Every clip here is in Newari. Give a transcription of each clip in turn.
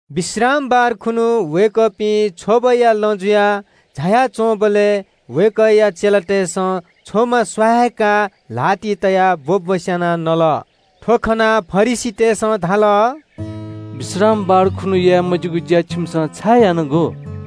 विश्रामबार खुन्हु वय्कःपिं छ्वबया लँ झाया च्वंबलय् वय्कःया चेलातय्सं छ्वमा स्वाहाय्काः ल्हातिइ तयाः ब्वब्वस्यानाः नल। थ्व खनाः फरिसीतय्सं धाल – “विश्रामबार खुन्हु याये मज्यूगु ज्या छिमिसं छाय् यानागु?”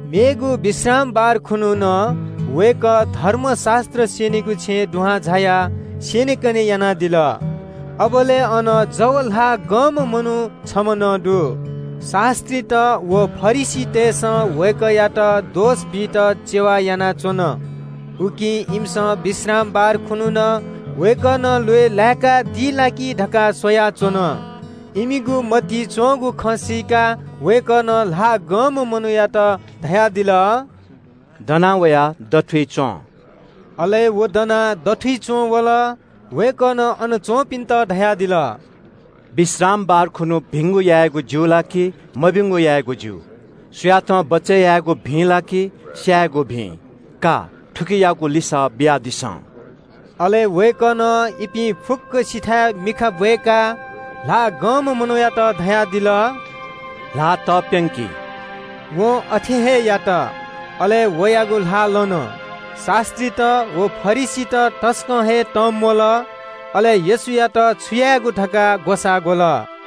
मेगु विश्रामबार खुन्हु नं वय्कः धर्मशास्त्र स्यनीगु छेँय् झायाः स्यनेकने यानादिल। अबलय् अन जव ल्हाः गंम्ह मनू छम्ह नं दु। शास्त्रीत व फरिसीतय्सं वय्कःयात दोष बीत चेवा यानाच्वन। उकिं इमिसं विश्रामबार खुन्हु नं वय्कलं ल्वय् लाय्कादी ला कि धकाः स्वयाच्वन। इमिगु मतिइ च्वंगु खँ सीकाः वय्कलं ल्हाः गंम्ह मनूयात धयादिल – “दना वयाः दथुइ च्वँ।” अले व दनाः दथुइ च्वंवल। वय्कलं अन च्वंपिन्त धयादिल – “विश्रामबार खुन्हु भिंगु यायेगु ज्यू ला कि मभिंगु यायेगु ज्यू? सुयातं बचय् यायेगु भिं ला कि स्यायेगु भिं? का, थुकियागु लिसः बियादिसँ।” अले वय्कलं इपिं फुक्कसिथाय् मिखा ब्वय्काः ल्हाः गंम्ह मनूयात धयादिल – “ल्हाः तप्यंकि।” वं अथे हे यात। अले वयागु ल्हाः लन। शास्त्रीत व फरिसीत तसकं हे तंम्वल, अले येशूयात छु यायेगु धकाः ग्वसाः ग्वल।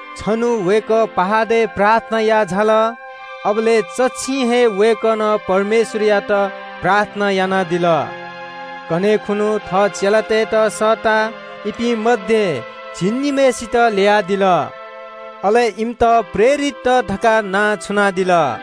छन्हु वय्कः पहाडय् प्रार्थना याः झाल। अबलय् चच्छिं हे वय्कलं परमेश्वरयात प्रार्थना यानादिल। कन्हय् खुन्हु सुथय् थः चेलातय्त सःताः इपिं मध्ये झिंनिम्हय्सित ल्ययादिल। अले इमित प्रेरितत धकाः नां छुनादिल।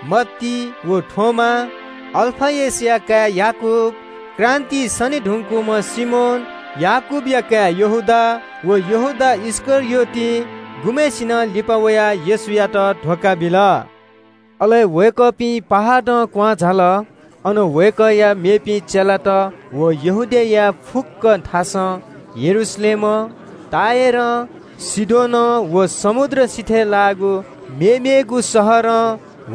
मत्ती व थोमा, अल्फयसया काय् याकूब, क्रान्तिइ सने धुंकूम्ह सिमोन, याकूबया काय् यहूदा, व यहूदा इस्करियोत गुम्हय्सिनं लिपा वयाः येशूयात धोखा बिल। अले वय्कःपिं पहाडं क्वहां झाल। अन माथंवंथाय् वय्कःया यक्व चेलातनापं यहूदियाया फुक्क थासं, यरूशलेमं, समुद्र सिथय् लाःगु टुरोस व सीदोनया इलाकां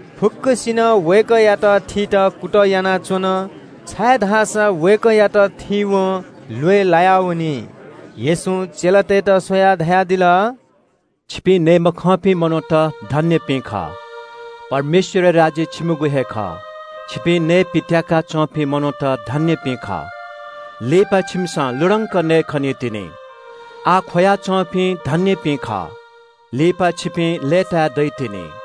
फुक्कसिनं वय्कःयात थीत कुतः यानाच्वन, छाय्धाःसा वय्कःयात थीवं ल्वय् लायावनी। येशूं चेलातय्त स्वयाः धयादिल – “छिपिं नये मखंपिं मनूत धन्यपिं खः। परमेश्वरया राज्य छिमिगु हे खः। छिपिं नयेपित्याका च्वंपिं धन्यपिं खः, छाय्धाःसा छिमिसं लुधंके खनीतिनि। आः ख्वया च्वंपिं धन्यपिं खः, छाय्धाःसा छिपिं लय्ताये दइतिनि।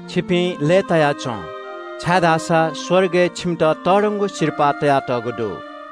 छिपिं लय्ताया च्वँ, छाय्धाःसा स्वर्गय् छिमित तःधंगु सिरपाः तयातःगु दु।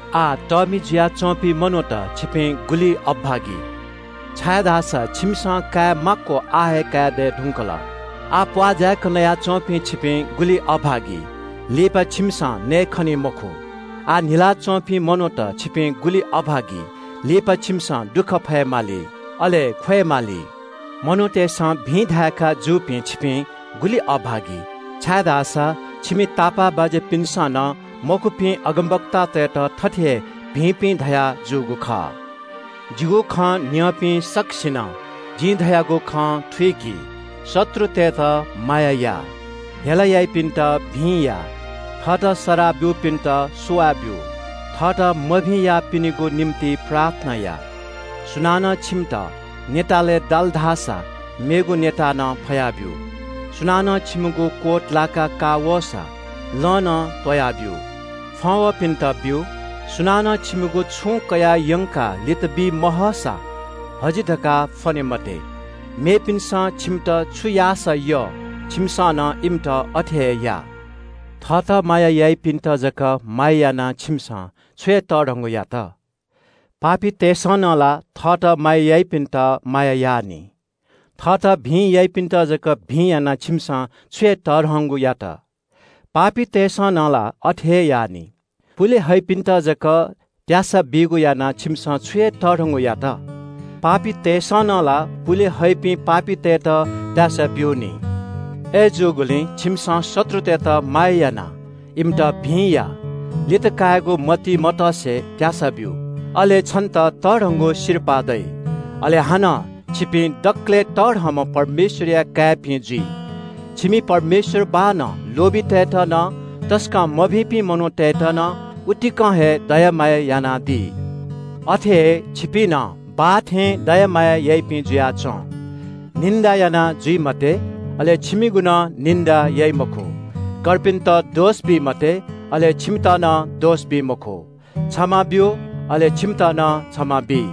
“आः तःमि जुयाच्वंपिं मनूत – छिपिं गुलि अभागी, छाय्धाःसा छिमिसं काये माक्व आः हे काये दये धुंकल। आः प्वाः जाय्क नया च्वंपिं, छिपिं गुलि अभागी, लिपा छिमिसं नयेखनी मखु। आः न्हिलाः च्वंपिं मनूत, छिपिं गुलि अभागी, लिपा छिमिसं दुःख फयेमाली, अले ख्वयेमाली। मनूतय्सं भिं धाय्का जूपिं छिपिं गुलि अभागी, छाय्धाःसा इमि तापाःबाज्यापिन्सं नं मखुपिं अगमवक्तातय्त थथे हे भिंपिं धयाजूगु खः।” “जिं छिमित धाये बांलाक न्यँ, शत्रुतय्त माया या, हेला याइपिन्त भिं या। थःत सराः ब्यूपिन्त सुवाः ब्यु। थःत मभिं याःपिनिगु निंतिं प्रार्थना या। सुनानं छिमित न्यतालय् दाल धाःसा मेगु न्यता नं फया ब्यु। सुनानं छिमिगु गा लाका का वःसा, लं नं त्वया ब्यु। फ्वं वःपिन्त ब्यु। सुनानं छिमिगु छुं कयाः यंकाः लितबी महःसां हजि धकाः फ्वने मते। मेपिन्सं छिमित छु याःसा यः, छिमिसं नं इमित अथे हे या।” “थःत माया याइपिन्त जक माया याःसा छिमिसं छु हे तःधंगु यात? पापीतय्सं नं ला थःत माया याइपिन्त माया याः नि। थःत भिं याइपिन्त जक भिं याःसा छिमिसं छु हे तःधंगु यात? पापीतय्सं नं ला अथे याः नि। पुले हइपिन्त जक त्यासा बीगु याःसा छिमिसं छु हे तःधंगु यात? पापीतय्सं नं ला पुले हइपिं पापीतय्त त्यासा ब्यू नि। “अय्जूगुलिं छिमिसं शत्रुतय्त माया यानाः इमित भिं या। लित कायेगु मतिइ मतसे त्यासा ब्यु। अले छन्त तःधंगु सिरपाः दइ। अले हानं छिपिं दकलय् तःधंम्ह परमेश्वरया काय्पिं जुइ। छिमि परमेश्वर बाःनं लोभीतय्त नं, तसकं मभिंपिं मनूतय्त नं, उतिकं हे दया माया यानादी। अथे हे छिपिं नं, बाः थें, दया माया याइपिं जुयाच्वँ।” “कर्पिनिगु न्याय याये मते, अले छिमिगु नं न्याय याइ मखु। कर्पिन्त दोष बी मते, अले छिमित नं दोष बी मखु। क्षमा ब्यु, अले छिमित नं क्षमा बी।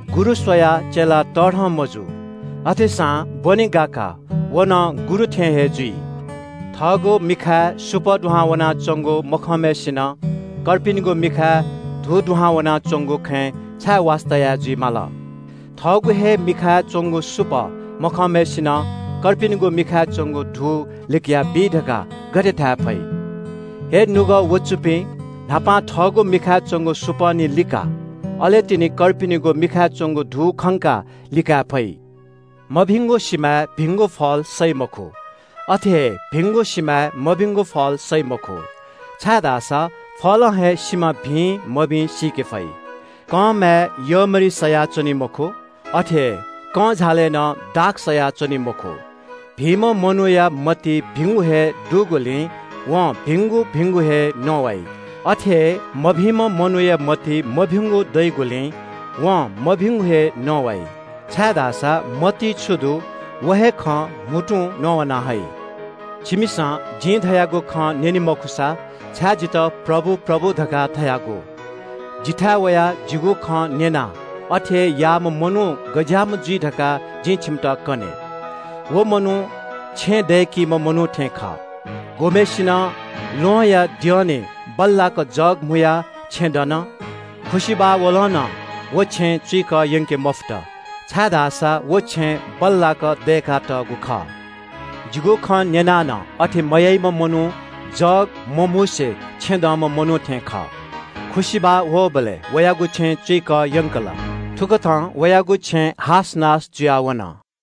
गुरु स्वयाः चेला तःधं मजू। अथेसां ब्वने गाकाः व नं गुरु थें हे जुइ। “थःगु मिखाय् सुपः दुहां वनाच्वंगु मखंम्हय्सिनं थः किजाया मिखाय् धू दुहां वनाच्वंगु खँय् छाय् वास्ता याः जुइ माल? थःगु हे मिखाय् च्वंगु सुपः मखंम्हय्सिनं थः किजाया मिखाय् च्वंगु धू लिकयाबी धकाः गथे धाये फइ? हे निपाः ख्वाःपाः दुपिं, न्हापां थःगु मिखाय् च्वंगु सुपः निं लिका। अले तिनि कर्पिनिगु मिखाय् च्वंगु धू खंकाः लिकाये फइ।” “मभिंगु सिमाय् भिंगु फल सइ मखु। अथे हे भिंगु सिमाय् मभिंगु फल सइ मखु, छाय्धाःसा फलं हे सिमा भिं मभिं सीके फइ। कंमाय् यःमरि सया च्वनी मखु। अथे हे कंझालय् नं दाख सया च्वनी मखु। भिंम्ह मनूया मतिइ भिंगु हे दइगुलिं वं भिंगु भिंगु हे न्ववाइ। अथे हे मभिंम्ह मनूया मतिइ मभिंगु दइगुलिं वं मभिंगु हे न्ववाइ, छाय्धाःसा मतिइ छु दु, व हे खँ म्हुतुं न्ववाना हइ।” “छिमिसं जिं धयागु खँ न्यने मखुसा, छाय् जितः प्रभु, प्रभु, धकाः धायेगु? जिथाय् वयाः जिगु खँ न्यनाः अथे हे याःम्ह मनू गज्याःम्ह जुइ धकाः जिं छिमित कने। व मनू छेँ दय्कीम्ह मनू थें खः। गुम्हय्सिनं ल्वहंया द्यःने बल्लाक जग म्हुयाः छेँ दन। खुसिबाः वलं नं व छेँ चुइकः यंके मफुत, छाय्धाःसा व छेँ बल्लाक दय्कातःगु खः। जिगु खँ न्यनाः नं अथे मयाइम्ह मनू जग मम्हुसे छेँ दंम्ह मनू थें खः। खुसिबाः वःबलय् वयागु छेँ चुइकः यंकल। थुकथं वयागु छेँ हासनास जुयाः वन।”